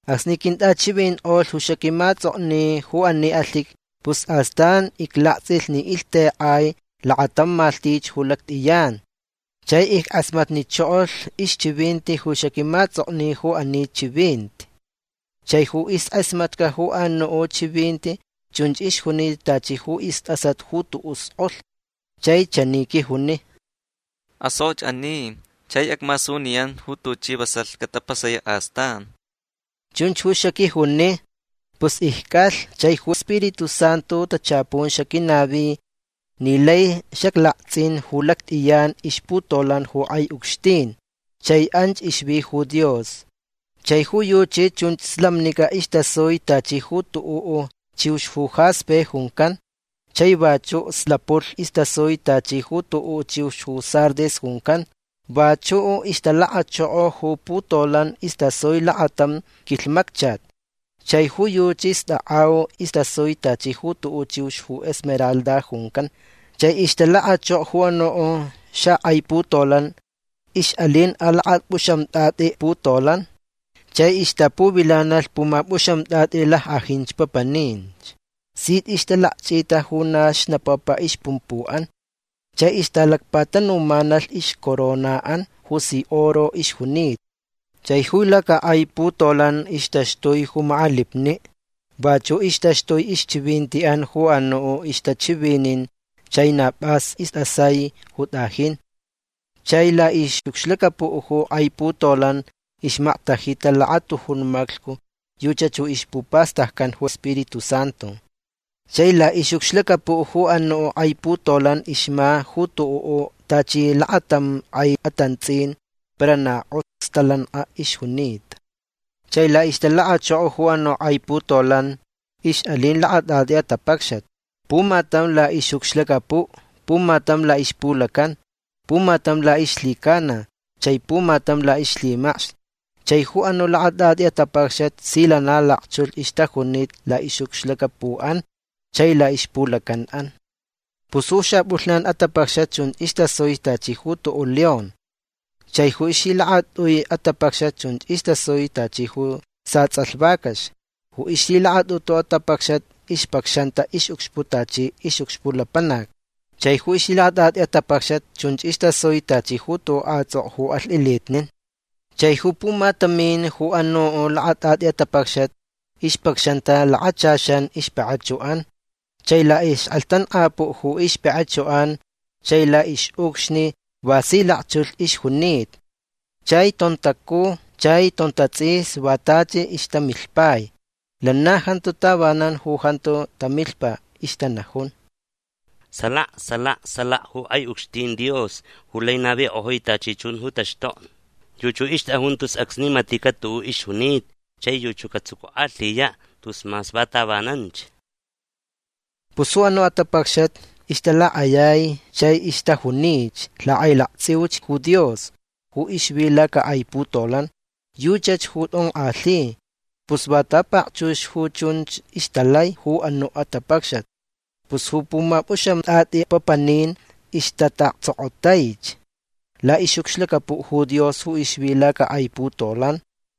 Acsni quintʼachivinkʼolh ju xaquimaʼatsʼokni ju ani alhiqui pus astan iclaktsʼilh ni ilhtekʼai lakatam malhtich ju lactʼiyan. Chai ickʼasmatnichokolh ixchivinti ju xaquimaʼatsʼokni ju ani chivinti. Chai ju iskʼasmatca ju anuʼ chivinti chunch ixjunita tachi ju istʼasat ju tuʼuʼ skʼolh. Chai chani quijuni: ―Asokʼoch ani chai acmasuniyan ju tuchi vasalh catapasayaʼ astan. ―Chunch ju xaquijuni. Pus icʼalh chai ju Spiritu Santu tachapun xaquinavi ni lai xaclaktsʼin ju lactʼiyan ixputolan ju kʼai ucxtin. Chai anch ixvi ju Dios. Chai ju yuchi chun slamnicʼa istasui tachi ju tuʼuʼ chiux ju jaspe juncan. Chai vachuʼ slapulh istasui tachi ju tuʼuʼ chiux ju sardis juncan. Vachuʼ ixtalakachoko ju putolan istasui lakatam quilhmacchat. Chai ju yuchi stakʼau istasui tachi ju tuʼuʼ chiux ju esmeralda juncan. Chai ixtalakachoko ju anuʼ xakʼai putolan ixʼalin alakapʼuxamtʼatʼi putolan. Chai ixtapuvilanalh pumapʼuxamtʼatʼi lackʼajin papaninch. Sich ixtalakchʼita ju na xnapapa ixpumpuʼan. Chai ixtalacpatanumanalh ixcoronaʼan ju si oro ixjunita. Chai ju lacakʼai putolan ixtaxtui ju makʼalipniʼ. Vachuʼ ixtaxtui ixchivintiʼan ju anuʼ ju ixtachivinin. Chai na pʼas istʼasai ju tʼajin. Chai laʼixʼucxlacapuʼ ju kʼai putolan ixmaktajita lakatujun maclhcu. Yuchach ju ixpupastaccan ju Spiritu Santu. Chai laʼixʼucxlacapuʼ ju anuʼ kʼai putolan ixma ju tuʼuʼ tachi lakatam kʼai atantsʼin. Para na kʼox stalankʼa ixjunita. Chai laʼixtalakachoko ju anuʼ kʼai putolan ixʼalin lakatʼatʼi atapacxat. Pumatam laʼixʼucxlacapuʼ. Pumatam laʼixpulacan. Pumatam laʼixlhicana. Chai pumatam laʼixlhimacx. Chai ju anuʼ lakatʼatʼi atapacxat si lana lakchulh ixtajunita laʼixʼucxlacapuʼan chai laʼixpulacanʼan. Pus ju xapʼulhnan atapacxat chunch istasui tachi ju tuʼuʼ león. Chai ju ixlhilakatʼui atapacxat chunch istasui tachi ju satsʼalh vacax. Ju ixlhilakatʼutu atapacxat ixpacxanta ixʼucxpuʼ tachi ixʼucxpuʼ lapanac. Chai ju ixlhilakatʼatʼi atapacxat chunch istasui tachi ju tuʼuʼ kʼatsʼokʼo ju alhtʼilitnin. Chai ju pumatamin ju anuʼ lakatʼatʼi atapacxat ixpacxanta lakachaxan ixpakʼachuʼan. Chai laʼixkʼelhtankʼajpuʼ ju ixpakʼachuʼan chai laʼixʼucxni va si lakchulh ixjunita. Chai tontacuj chai tontatsʼis va tachi ixtamilhpai. Lana jantu tavanan ju jantu tamilhpa. Ixtanajun: Salaka. Salaka. Salaka ju kʼai ucxtin Dios ju lai navikʼojui tachi chun ju taxtokni. Yuchi ju ixtʼajun tus acsni maticaʼ tuʼuʼ ixjunita chai yuchi ju catsucukʼalhiyaʼ tus mas va tavananch. Pus ju anuʼ atapacxat ixtalakʼayai chai ixtajunich lakʼailaktsʼiuch ju Dios ju ixvi lacakʼai putolan. Yuchach ju tʼonkʼalhi. Pus va ta pakchux ju chunch ixtalai ju anuʼ atapacxat pus ju pumapʼuxamtʼatʼi papanin ixtataʼaktsokotaich laʼixʼucxlacapuʼ ju Dios ju ixvi lacakʼai putolan.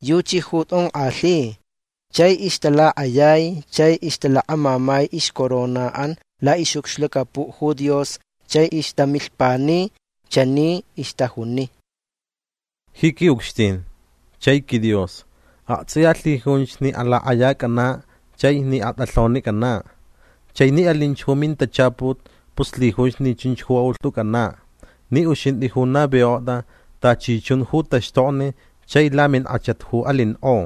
Yuchi ju jonkʼalhita. Chai ixtalakʼayai. Chai ixtalakamamai ixcoronaʼan laʼixʼucxlacapuʼ ju Dios chai ixtamilhpani. Chani ixtajuni: Ji quiʼucxtin chai quiDios aktsʼiya lhijunch ni alakʼayacʼanaʼ chai ni atʼalhonicʼanaʼ. Chai ni alinch ju mintachaput pus lhijunch ni chunch ju aʼulhtʼucʼanaʼ ni uxintʼi ju navikʼotʼa tachi chun ju taxtokni chai laminkʼachat ju alinkʼo.